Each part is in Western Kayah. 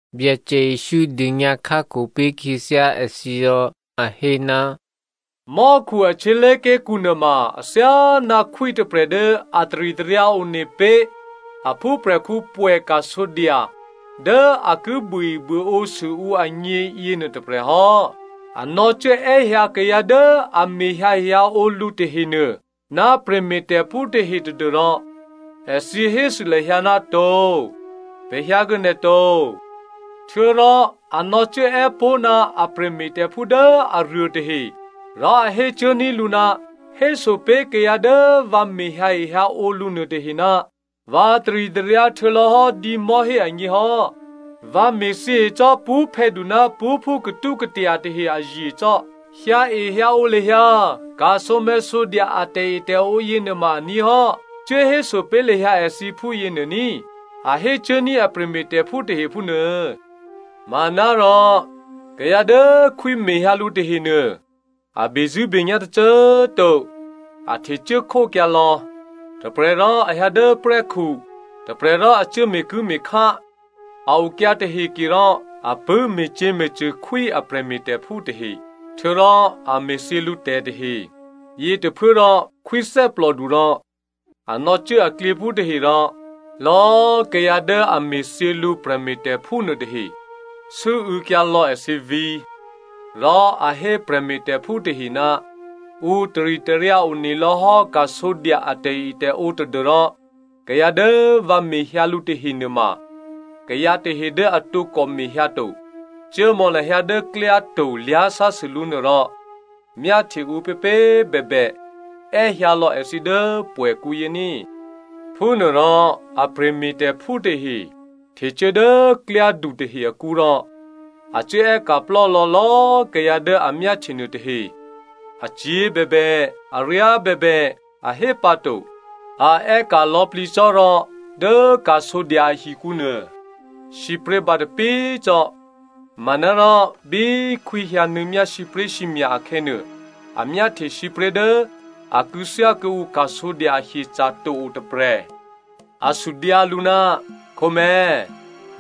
Byacè Jesǔ dônyǎ khákho pé̤ khyěthyá èthǐ rò a hé, “Mò́khu a htyělé̤ké̤kǔ nuôma athyáná khwí tôprè̤ dố a taritaryǎ one pé̤ a phúprè̤khǔ pwè̌ ka̤sǒdya dố a ki buôebuôǒ sû ǔ agně yěnuô tôprè̤hò́. A nò̌cuố è́hyǎ kayǎ dố a mehyǎehyǎǒ lǔ tahenuô ná prè̤me̤tè̤phú tahe tadû́rò èthǐ hésû lahyǎ, ‘To, pè̤ hyǎkuô̌ nè̤ to.’ “Htuô̌rò a nò̌cuốè́ pó̤ ná a prè̤me̤tè̤phú dố aruô tahe rò a hécuốní̤ lǔ, ‘Héso pé̤ kayǎ dố vǎ mehyǎehyǎǒ lǔ nuôtahe, vǎ taritaryǎ htuô̌lò̌ hò́ dǐmò̤́hé agněhò́. Vǎ me̤thyěe cò́ pṳ́phè̌du ná pṳ́phú katúkatya tahe azye cò́. Hyǎehyǎǒ lahyǎ ka̤sǒmè̤̌sǒdya a tè̤etè̤ǒ yěnuôma aní̤ hò́, cuốhéso pé̤ lahyǎ èthǐ phúyěnuô ní꤮’ a hécuốní̤ a prè̤me̤tè̤phú tahe phúnuô. “Manárò kayǎ dố khwí mehyǎ lǔ tahenuô a bezṳ̂́benyá̤ tôcô꤮ to. A htecuố khókyǎ lò̌. Tôprè̤ rò a hyǎ dố prè́khu, tôprè̤ rò a cuố me̤kuố̤me̤khá. A okyǎ tahe ke rò a pṳ̂́ me̤cyě̤me̤cṳ̂ khwí a prè̤me̤tè̤phú tahe, htuô̌rò a me̤thyě lǔtè̤ tahe. Yětôphuốrò khwí thè́plòdu rò a nò̌cuố aklyěphú tahe rò èthǐ cuốme̤thyěkyǎ lò̌꤮ kayǎ dố a me̤thyě lǔ prè̤me̤tè̤phú nuôtahe rò sû́û̌kyǎ lò̌ èthǐ vǐ̤. “Rò a hé prè̤me̤tè̤phú tahe, ‘Ǔ taritaryǎ one lò̌hò́ ka̤sǒdya a tè̤etè̤ǒ tadû́rò kayǎ dố vǎ mehyǎ lǔ tahe nuôma kayǎ tahe dố a tǒkò mehyǎ to. Cuốmò̌ lahyǎ dố klyáto̤ klyásásû lǔ nuô rò myáhtye ǔpěpě꤮ bèbè è́hyǎlò̌ èthǐ dố pwè̌kǔyě ní꤮.’ Phúnuôrò a prè̤me̤tè̤phú tahe htecuố dố klyádu tahe akǔ rò a cuốè́ka̤ plò́lò̌ lò̌꤮ kayǎ dố a myáhtye nuôtahe. Acyě̤ bèbè, aryá bèbè, a hé pǎ to, a è́ka̤ lò̌plǐ cò́ rò dố ka̤sǒdya ahikǔ nuô sǐpré̤ bǎtapí꤮ cò́. “Manárò bí khwí hyǎnuô̌myá sǐpré̤sǐmya̤ akhè̌nuô, a myáhtye sǐpré̤ dố a kû̌thyá kuô̌ǔ ka̤sǒdya a hyeca̤ to o tôprè̤. A sudyǎ lǔ, ‘Khǒmè̤̌꤮,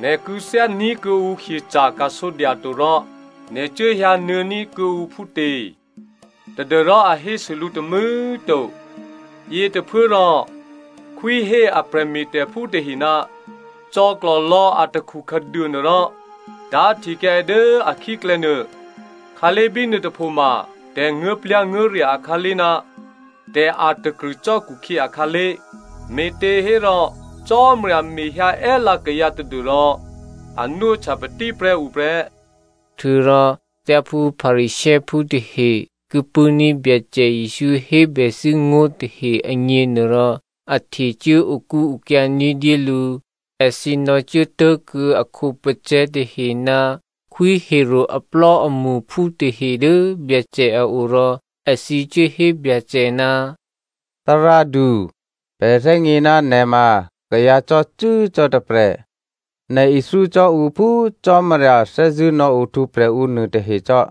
nè̤ kû̌thyání̤ kuô̌ǔ hyeca̤ ka̤sǒdya to rò nè̤ cuố hyǎnuô̌ ní̤ kuô̌ǔ phútě?’ Tadû́rò a hésû lǔ tômû̌꤮ to. “Yětôphuốrò khwí hé a prè̤me̤tè̤phú tahe, ‘Cò̌klò̤lò̌ atakhu khǎduô nuô rò tá̤htekyǎ è dố akhíklè̌ nuô. Khǎlé̤ bínuô tôphoma tè̤nguố̤plyá̤nguố̤rya̤ akhǎlé̤ ná tè̤ a̤takrṳ̂ cò́ khukhyě akhǎlé̤.’ “Me̤těhérò Cò́marya mehyǎ è́lǎ kayǎ tadû́rò a nwóhtya patíprè́ ǔ prè́.” Htuô̌rò thyáphú Pharisěophú tahe ki pṳ̂́ní̤ Byacè Jesǔ hébèthû́ ngó̤ tahe agněnuôrò, a htecuố okúokyá ní̤dyé lǔ. Èthǐ nò̌cuố tố̤kuô̌ a khǒpacè̤̌ tahe ná Khwí Herodè aplò́amṳphú tahe dố Byacè a o rò èthǐ cuốhé Byacè, “Thárádu, pè̤ thè́gně ná nè̤ ma kayǎ cò́cû́cò́ tôprè̤. Nè̤ ithyó cò́ ǔ phú Cò́marya thè́zṳ̂́ nò̌ohtwǒprè̤ ǔ nuôtahecò́.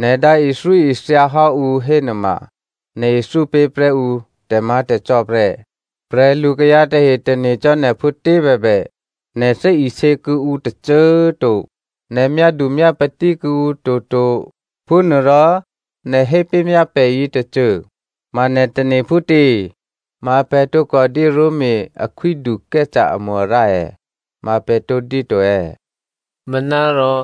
Nè̤ dǎ ithyóithyahò́ ǔ hénuôma nè̤ ithyó pé̤prè́ ǔ tè̤má̤tè̤cò́ prè́. Prè̤lukayǎ tahe tane̤cò́ nè̤ phútě bèbè, nè̤ thè́isě kuô̌ǔ tôcô꤮ to. Nè̤ myádu myápatí kuô̌ǔ toto. Phúnuôrò nè̤ hépé̤myá pè̤ yětôcô, ma nè̤ tane̤ phútě? Ma pè̤ tǒkòdyé Roma akhwídu Caesare amo-arǎ è̌? Ma pè̤ tǒdyé to è̌?” Manárò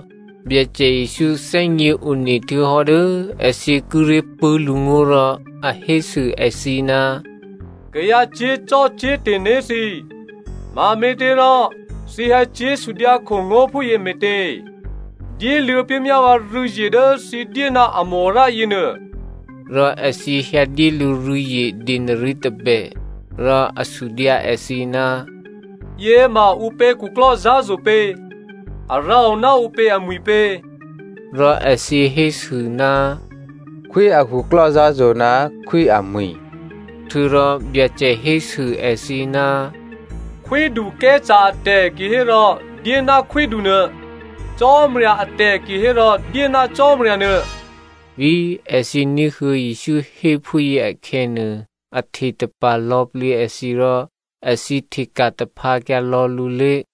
Byacè Jesǔ thè́gněone htuô̌hò́ dố èthǐ kíré̤ pṳ̂́ lǔngó̤ rò a hésû èthǐ, “Kayǎ cyé̤zò́cò́te̤ né̤ thǐ꤮, mame̤těrò thǐ hyǎcyé̤ sudyǎkho ngó̤ phúyě me̤tě? Dyéluô̌ pé̤myá vǎ rû̌zye dố thǐ dyé ná amo-arǎ yěnuô,” rò èthǐ hyǎdyé lǔ rû̌zye denari tôbè. Rò a sudyǎ èthǐ, “Yěma ǔpě khuklò́zǎ̤zo̤ pě? A rǎo ná ǔpě amwi̤pě?” Rò èthǐ hésû, “Khwí a khuklò́zǎ̤zo̤ ná khwí amwi̤.” Htuô̌rò Byacè hésû èthǐ, “Khwídu Caesare atè̤ kihérò dyé ná khwídunuô, Cò́marya atè̤ kihérò dyé ná Cò́marya nuô.” Bí èthǐ ní̤huô̌ Jesǔ hé phúyě akhè̌nuô, a htetapa̤ lò̌plǐ èthǐ rò èthǐ hteka̤ taphǎkyǎ lò̌ lǔlé̤.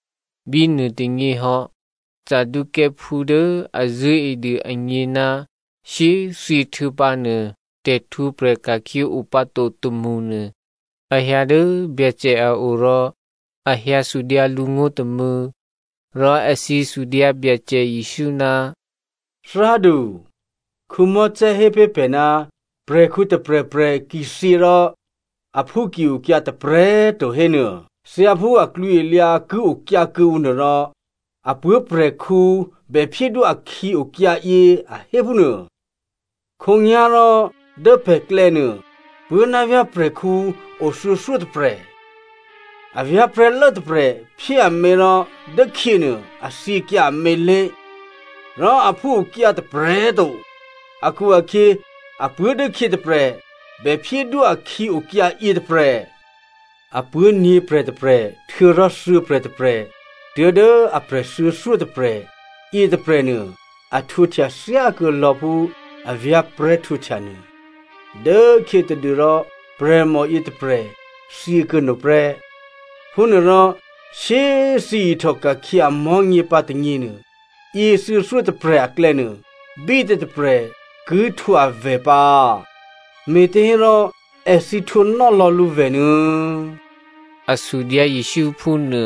Bínuô tônyěhò́, Saducěophú dố a zṳ̂́edû agně ná shyé꤮ thyěhtuô̌pǎ nuô tè̤htwǒprè̤ ka̤khyě o pǎ to tômṳnuô a hyǎ dố Byacè a o rò a hyǎ sudyǎ lǔ ngó̤ tômû̌. Rò èthǐ sudyǎ Byacè Jesǔ, “Thárádu, Mosè hé pé̤ pè̤ ná prè̤khǔ tôprè̤prè̤ ki thyě rò aphú ki okyǎ tôprè̤꤮ to hénuô, thyáphú aklwǐalyǎ ki okyǎ kuô̌ǔ nuôrò, a puố̤prè̤khǔ bè phyédwó akhǐ okyǎyě, a hé phúnuô. Khǒnyá̤rò dố pè̤klè̌nuô puố̤ ná vyá̤ prè̤khǔ o thuô̌thyótôprè̤. A vyá̤prè̤́lố tôprè̤ phyé amě rò dốkhyěnuô a thyěkyǎ amě lé̤, rò aphú okyǎ tôprè̤꤮ to akhu-akhyě apuố̤ dốkhyě tôprè̤ bèphyédwó akhǐ okyǎ yětôprè̤. Apuố̤ nyě̤prè̤ tôprè̤ htuô̌rò thuô̌prè̤ tôprè̤ tuố̤dố aprè̤ thuô̌thyótôprè̤ yětôprè̤nuô a htwǒhtya thyákuô̌ lò̌ phú avyá̤prè̤́ htwǒhtya nuô. Dốkhyětadû rò prè̤mò yětôprè̤ thyě kuô̌no prè́. Phúnuôrò shyé꤮ thyěihtòka̤khyě amò̤́nyě pǎ tônyěnuô, yě thuô̌thyótôprè̤. Aklè̌nuô, bítě tôprè̤ ki htwǒ avè̤ pǎ? Me̤těhérò èthǐ htwǒnò́lò̌ lǔvè̤ nuô̌꤮,” a sudyǎ Jesǔ phúnuô.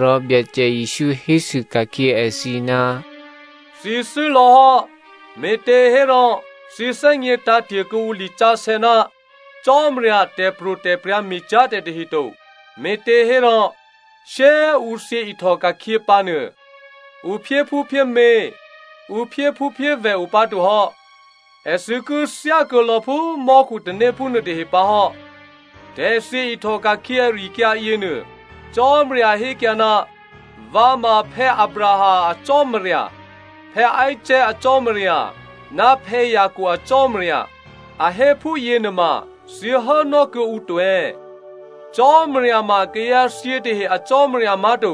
Rò Byacè Jesǔ hésû ka̤khyě èthǐ, “Thǐ thû́ lò̌hò́, me̤těhérò thǐ thè́gně tǎ̤te̤ kuô̌ǔ lisǎsè̌ ná Cò́marya a tè̤pro̤tè̤prya̤ me̤cyá̤ tè̤ tahe to. Me̤těhérò shyé꤮ ǔ thyě ihtòka̤khyě pǎnuô ǔ phyéphúphyémě, ǔ phyéphúphyévè̤ o pǎtohò́, èthǐ ki thyákuô̌lò̌ phú mò́khutanéphú nuôtahe pǎhò́. Tè̤thyě ihtòka̤khyě ari-akyǎ yěnuô, Cò́marya hékyǎ, ‘Vǎ ma Abraham a Cò́marya, Isaac a Cò́marya, ná Jacob a Cò́marya,’ a hé phúyě nuôma thǐ hốnò́ kuô̌ǔ to è̌? Cò́marya ma kayǎthyě tahe a Cò́marya má̤to,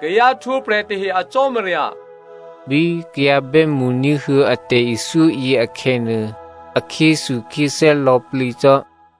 kayǎ htwǒprè̤ tahe a Cò́marya.” Bí kayǎ bè́mṳ ní̤huô̌ a tè̤ithyóyě akhè̌nuô, a khyéthukhyéthè́ lò̌plǐ cò́.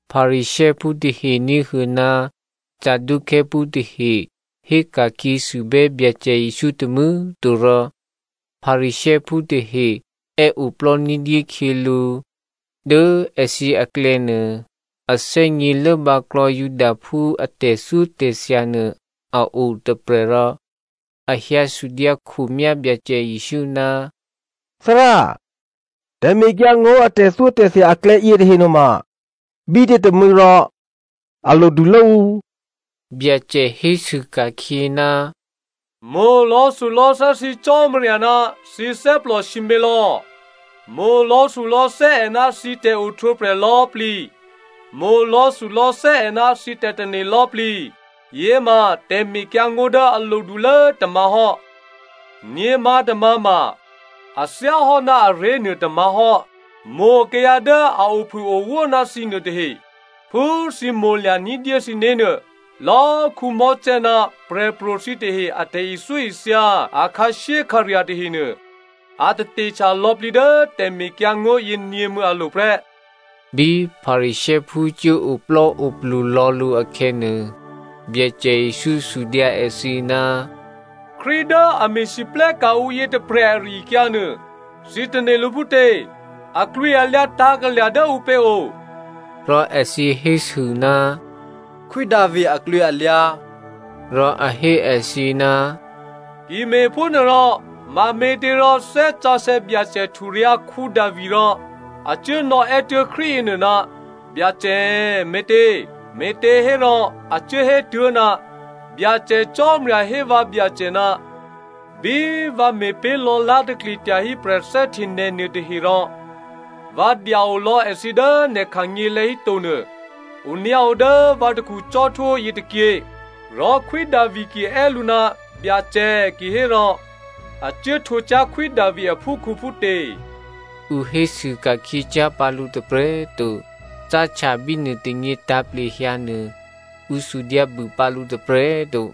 Pharisěophú tahe ní̤huô̌ ná Saducěophú tahe héka̤khyě sûbè́ Byacè Jesǔ tômû̌꤮ to rò Pharisěophú tahe è́oplò́ ní̤dyé khyělǔ. Dố èthǐ aklè̌nuô, a thè́gně lốbǎklò̌ Judaphú a tè̤thyótè̤thya nuô a otôprè̤ rò a hyǎ sudyǎkhomyá Byacè Jesǔ, “Thárá, tè̤mekyǎngó̤ a tè̤thyótè̤thya aklè̌ yětahe nuôma bítě tômû̌ rò a lodulố ǔ?” Byacè hésû ka̤khyě, “‘Mo̤ lò̌thulò̌thè́ thǐ Cò́marya ná thǐ thè́plò sǐmělò̌, mo̤ lò̌thulò̌thè́ è ná thǐ tè̤ohtwǒprè̤ lò̌꤮ plǐ, mo̤ lò̌thulò̌thè́ è ná thǐ tè̤tane̤ lò̌꤮ plǐ.’ Yěma tè̤mekyǎngó̤ dố a lodulố tômǎ̤ hò́. Nyě̤mǎ̤tômǎ̤ ma, a thyáhò́ ná aré̤ nuô tômǎ̤ hò́, ‘Mo̤ kayǎ dố a ophûowó ná thǐ nuôtahe phú thǐ mo̤lya̤ ní̤dyé thǐné̤ nuô.’ Lò̌꤮ Mosè ná prè̤pro̤ thǐtahe a tè̤ithyóithya a khǎshyékhǎrya̤ tahenuô a tatehtya lò̌plǐ dố tè̤mekyǎngó̤ yěnyě̤mû̌ alo̤ prè́.” Bí Pharisěophú cuố oplò́oplu lò̌ lǔ akhè̌nuô, Byacè Jesǔ sudyǎ èthǐ, “Krístu dố a me̤lwóhteka̤ ǔ yětôprè̤ ari-akyǎ nuô, thǐ tane̤ lǔ phútě? Aklwǐalyǎ tǎ̤kalya̤ dố ǔpě o?” Rò èthǐ hésû, “Khwí Davi aklwǐalyǎ.” Rò a hé èthǐ, “Ki me̤phúnuôrò mame̤těrò Thè́ Sǎsè̌ Byacè hturyǎ̤ Davi rò a cuốnò̌ è́tuố̤ Krístu yěnuô, ‘Byacè’ me̤tě꤮? Me̤těhérò a cuốhé tuố̤, ‘Byacè Cò́marya hé vǎ Byacè, “Bí vǎ me̤pé̤ lò̌lá̤takli tyahí prè̤thè́hte nè̤ nuôtahe rò vǎ dya-olò̌ èthǐ dố nè̤ khanyělè̤̌ híto nuô, onyǎo dố vǎ takhu cò́htwó yětôkyě.”’ “Rò Khwí Davi ki è́ lǔ, ‘Byacè’ kihérò a cuố htwǒ cyá̤ Khwí Davi aphúkhǔ phútě?” Ǔ hésû ka̤khyě cyá̤ pǎ lǔ tôprè̤꤮ to. Cáhtya bínuô tônyě tǎ̤plehyǎ nuô ǔ sudyǎbû pǎ lǔ tôprè̤꤮ to.